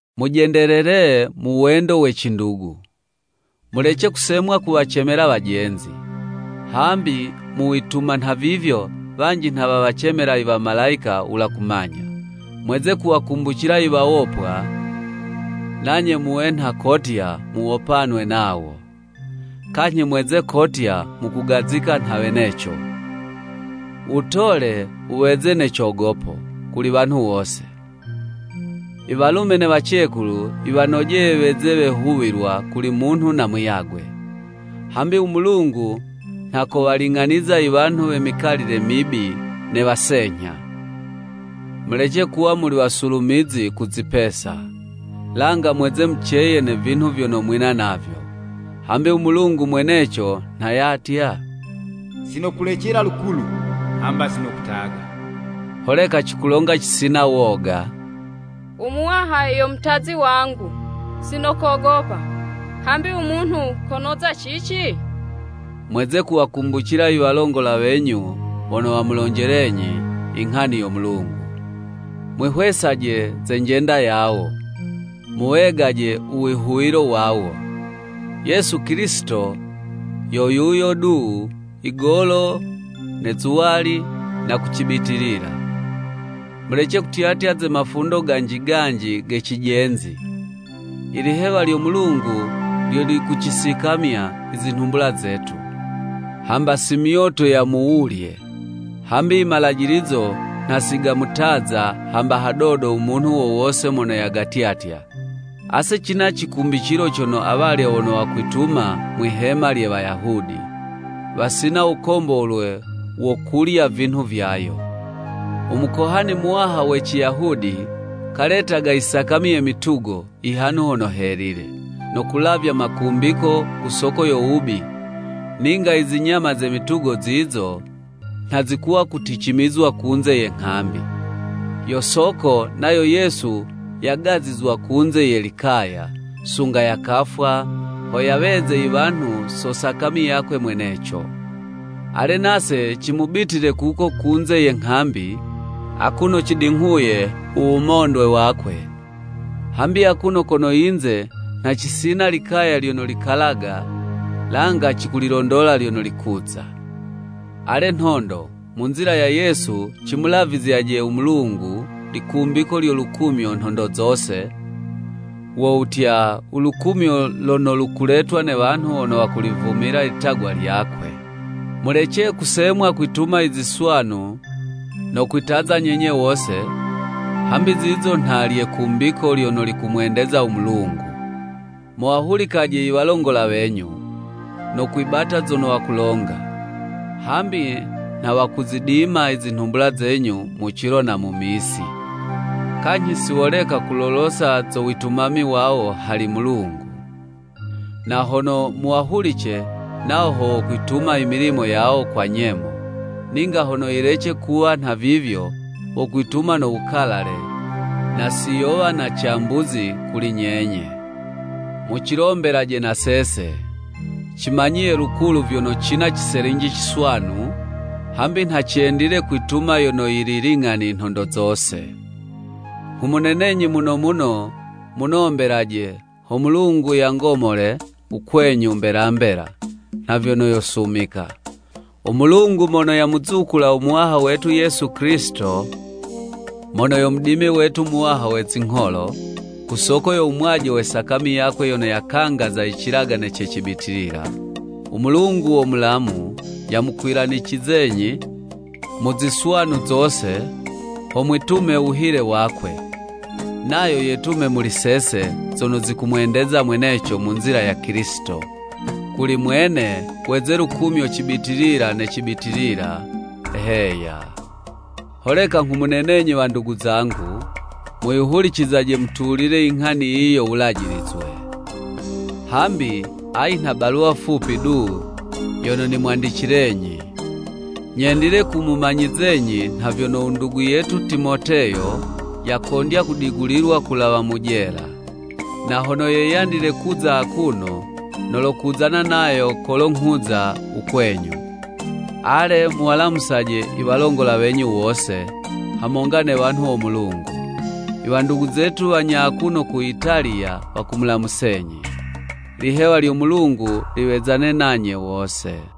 Mujendelele mu wendo we cindugu. Mulece kusemwa kuwacemela wajenzi; hambi mu wituma nhavivyo, wanji nha wawacemela i wamalayika wula kumanya. Mweze kuwakumbucila i wawopwa nanye muwe nha kotya muwopanwe nawo. Kanyhi mweze kotya mukugazika nha weneco. U wutole wuweze ne cogopo kuli wanhu wose, i walume ne wacekulu yiwanojeye weze wehuwilwa kuli munhu na muyagwe. Hambi u Mulungu nha kowaling'aniza i wanhu we mikalile mibi ne wasenyha. Mulece kuwa muli wasulumizi ku zipesa, langa mweze muceye ne vinhu vyono mwina navyo. Hambi u Mulungu mweneco nha yatya, “Si nokulecela lukulu, hamba si nokutaga.” Holeka cikulonga cisina woga: “U Muwaha yo mutazi wangu, si nokogopa. Hambi u munhu konoza cici?” Mweze kuwakumbucila i walongola wenyu wono wamulonjelenyi i nghani yo Mulungu. Mwihwesaje ze njenda yawo, muwegaje u wihuwilo wawo. Yesu Kilisito yo yuyo du igolo ne zuwali, na ku cibitilila. Mulece kutyatya ze mafundo ganji ganji ge cijenzi. I lihewa lyo Mulungu lyo likucisikamya i zinhumbula zetu, hamba si myoto ya mu wulye; hambi i malajilizo nha si gamutaza hamba hadodo u munhu wo wose mono yagatyatya. Ase cina cikumbicilo cono awalya wono wakwituma mwihema lye Wayahudi, wasina wukombolwe wo kulya vinhu vyayo. U Mukohani Muwaha we Ciyahudi, kaletaga i sakami ye mitugo, i Hanhu Hono Helile, no kulavya makumbiko ku soko yo wubi ninga i zinyama ze mitugo zizo nha zikuwa kuticimizizwa kunze ye nghambi. Yo soko, nayo Yesu, yagazizwa kunze ye likaya, sunga yakafwa, ho yaweze i wanhu so sakami yakwe mweneco. Ale nase cimubitile kuko kunze ye nghambi, akuno cidinghuye u wumondwe wakwe. Hambi akuno kono yinze nha cisina likaya lyono likalaga; langa cikulilondola lyono likuza. Ale nhondo, mu nzila ya Yesu, cimulavizyaje u Mulungu, likumbiko lyo lukumyo nhondo zose, wo wutya, u lukumyo lono lukuletwa ne wanhu wono wakulivumila litagwa lyakwe. Mulece kusemwa kwituma i ziswanu no kwitaza nyenye wose, hambi zizo nha lye kumbiko lyono likumwendeza u Mulungu. Muwahulikaje i walongola wenyu, no kwibata zono wakulonga; hambi nha wakuzidima i zinhumbula zenyu mu cilo na mu misi, kanyhi si woleka kulolosa zo witumami wawo hali Mulungu. Na hono muwahulice, nawo ho wokwituma i milimo yawo kwa nyemo, ninga hono yilece kuwa nhavivyo, wokwituma no wukalale, na si yo wana cambuzi kuli nyenye. Mucilombelaje na sese. Cimanyiye lukulu vyono cina ciselinji ciswanu, hambi nha cendile kwituma yono yili ling'ani nhondo zose. Nghumunenenyi muno muno, munombelaje, ho Mulungu yangomole u kwenyu mbela mbela, nha vyono yosumika. U Mulungu yamuzukula u Muwaha wetu Yesu Kilisito mono yo Mudimi wetu Muwaha we zingholo, ku soko yo wumwaje we sakami yakwe yono yakangaza i cilagane ce cibitilila. U Mulungu wo mulamu, yamukwilanicizenyi mu ziswanu zose, ho mwitume wuhile wakwe; nayo yetume muli sese, zono zikumwendeza mweneco mu nzila ya Kilisito. Kuli mwene, weze lukumyo cibitilila ne cibitilila. Heya. Holeka nghumunenenyi wandugu zangu, muyihulicizaje mutulile i nghani yiyi yo wulanjizwe. Hambi ayi nha baluwa fupi du yono nimwandicilenyi. Nyendile kumumanyizenyi nha vyono u ndugu yetu Timoteyo yakondya kudigulilwa kulawa mu jela. Na hono yeyandile kuza akuno, nolokuzana nayo kolo nghuza u kwenyu. Ale, muwalamusaje i walongola wenyu wose, hamonga ne wanhu wo Mulungu! I wandugu zetu wanya akuno ku Italiya, wakumulamusenyi. Lihewa lyo Mulungu liwezane nanye wose.